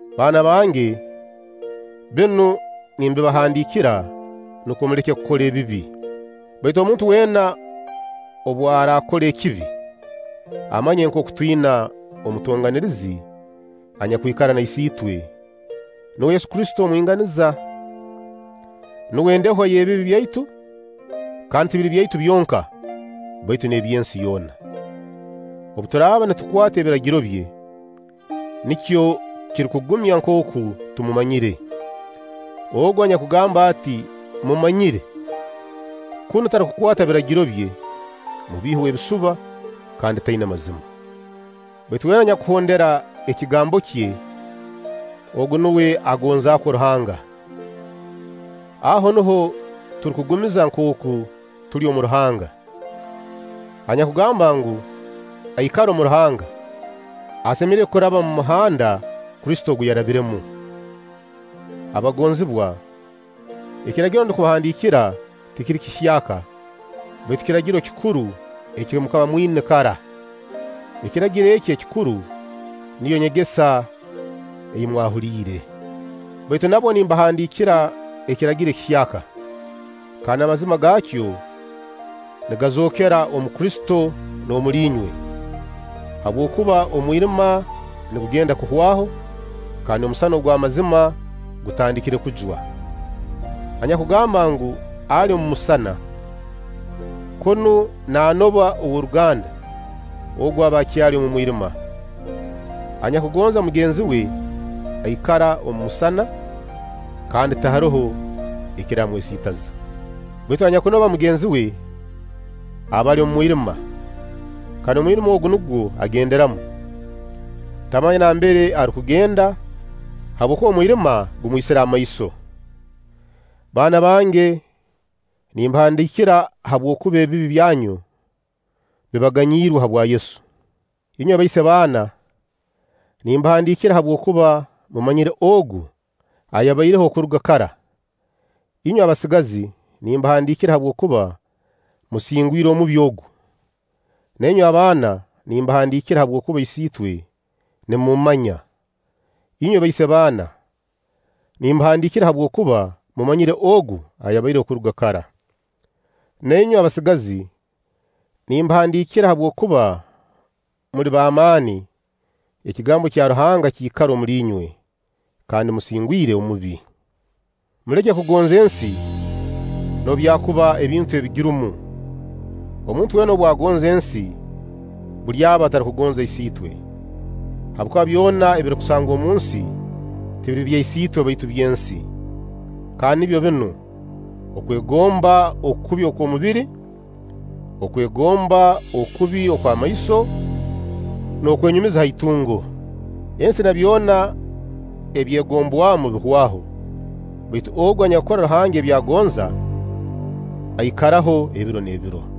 Baana bange, binu nimbibahandiikira nukwo muleke kukora ebibi; baitu omuntu weena obu araakora ekibi, amanye nkooku twina omutonganirizi anyakwikara na Isiitwe, nuwe Yesu Kristo omwinganiza. Nuwe ndehwa y'ebibi byaitu, kandi tibiri byaitu byonka, baitu n'eby'ensi yoona. Obu turaaba nitukwata ebiragiro bye, nikyo kirukugumya nkooku tumumanyire. Ogu anyakugamba ati: “Mmumanyire”, kunu tarukukwata biragiro bye, mubiihi w'ebisuba, kandi taina mazima. Baitu weena anyakuhondera ekigambo kye, ogu nuwe agonzakwo Ruhanga. aho nuho turukugumiza nkooku tuli omu Ruhanga: anyakugamba ngu, aikara omu Ruhanga, asemeriire kuraba omu muhanda Kristo ogu yarabiremu. Abagonzibwa, Ekiragiro ndukubahandiikira tikiri kihyaka, baitu kiragiro kikuru eki mukaba mwina kara. Ekiragiro eki ekikuru niyo nyegesa ei mwahuliire. Baitu nabwo nimbahandiikira ekiragiro ekihyaka, kandi amazima gaakyo nigazookera omu Kristo n'omuli inywe, habwokuba omwirima nigugenda kuhwaho, kandi omusana ogw'amazima gutandikire kujwa. Anyakugamba ngu, ali omu musana, kunu naanoba ow'oruganda, ogu aba akyali omu mwirima. Anyakugonza mugenzi we, aikara omu musana, kandi tiharoho ekiramwesiitaza. Baitu anyakunoba mugenzi we aba ali omu mwirima; kandi omwirima ogu nugwo agenderamu. Tamanya nambere arukugenda, habwokuba omwirima gumwisire amaiso. Baana bange, nimbahandiikira habwokuba ebibi byanyu bibaganyirwe habwa Yesu. Inywe baise-baana, nimbahandiikira habwokuba mumanyire Ogu ayabaireho okuruga kara. Inywe abasigazi, nimbahandiikira habwokuba musingwire Omubi ogu. Na inywe abaana, nimbahandiikira habwokuba Isiitwe nimumumanya. Inywe baise-baana, nimbahandiikira habwokuba mumanyire Ogu ayabaireho okuruga kara. Na inywe abasigazi, nimbahandiikira habwokuba muli b'amaani, ekigambo kya Ruhanga kiikara omuli inywe, kandi musingwire Omubi. Muleke kugonza ensi, noobu byakuba ebintu ebigirumu. Omuntu weena obu agonza ensi, buli aba atarukugonza Isiitwe. Habwokuba byona ebirukusangwa omunsi tibiri bya Isiitwe baitu by'ensi, kandi nibyo binu: okwegomba okubi okw'omubiri, okwegomba okubi okw'amaiso, n'okwenyumiza ha itungo. Ensi na byona ebyegombwamu bihwaho; baitu ogu anyakukora Ruhanga ebi agonza, aikaraho ebiro n'ebiro.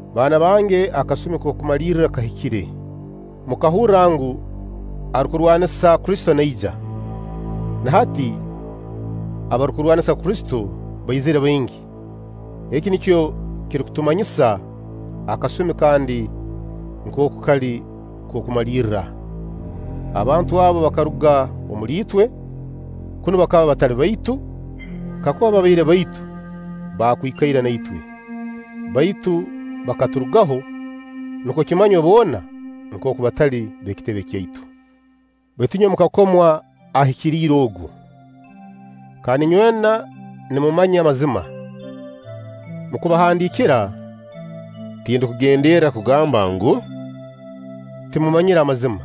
Baana bange, akasumi ak'okumalirra kahikire. Mukahurra ngu, arukurwanisa Kristo naija. Na hati abarukurwanisa Kristo baizire baingi; eki nikyo kirukutumanyisa akasumi kandi nkooku kali k'okumalirra. Abantu abo bakaruga omuli itwe, kunu bakaba batali baitu, kakuba babaire baitu, bakwikaire na itwe; baitu bakaturugaho, nukwo kimanywe boona nkooku batali b'ekitebe kyaitu. Baitu inywe mukakomwa Ahikiriire Ogu, kandi inywena nimumanya amazima. Mu kubahandiikira, tindukugenderra kugamba ngu, timumanyire amazima,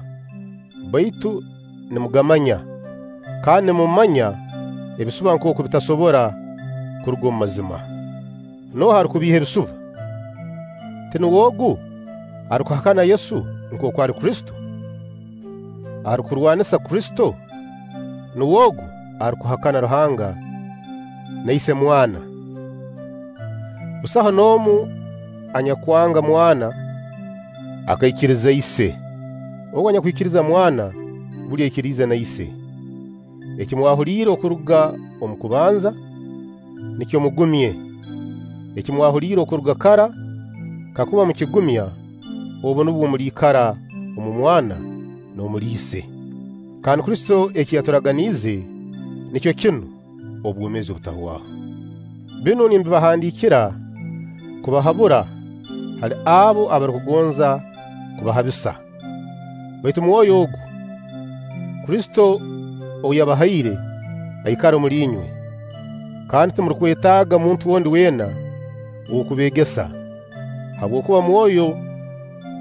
baitu nimugamanya, kandi nimumanya ebisuba nkooku bitasobora kuruga mu mazima. Nooha arukubiiha ebisuba? Tinuwe ogu arukuhakana Yesu nkooku ali Kristo? Arukurwanisa Kristo, nuwe ogu arukuhakana Ruhanga na Ise mwana. Busaho n'omu anyakwanga Mwana akaikiriza Ise. Ogu anyakwikiriza Mwana, buli aikiriza na Ise. Eki mwahuliire okuruga omu kubanza, nikyo mugumye. Eki mwahuliire okuruga kara kakuba mukigumya, obu nubwo muliikara omu Mwana n'omuli Ise. Kandi Kristo eki yaturaganiize nikyo kinu: obwomeezi obutahwaho. Binu nimbibahandiikira kubahabura hali abo abarukugonza kubahabisa. Baitu Mwoyo ogu, Kristo ou yabahaire, aikara omuli inywe, kandi timurukwetaaga muntu ondi weena ow'okubeegesa; habwokuba Mwoyo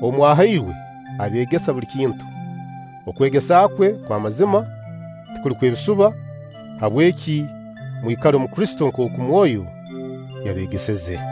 ou mwahairwe, abeegesa buli kintu. Okwegesa kwe kw'amazima, tikuli kw'ebisuba. Habweki mwikale omu Kristo, nkooku Mwoyo yabeegeseze.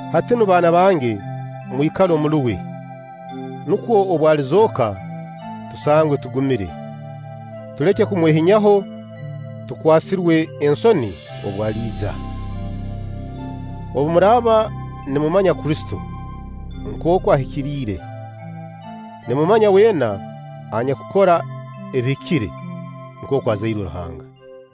Hati nu, baana bange, mwikale omuli uwe, nukwo obu alizooka tusangwe tugumire, tuleke kumwehinyaho tukwasirwe ensoni obu aliija. Obu muraaba nimumanya Kristo nkooku ahikiriire, nimumanya weena anyakukora ebihikire nkooku azairwe Ruhanga.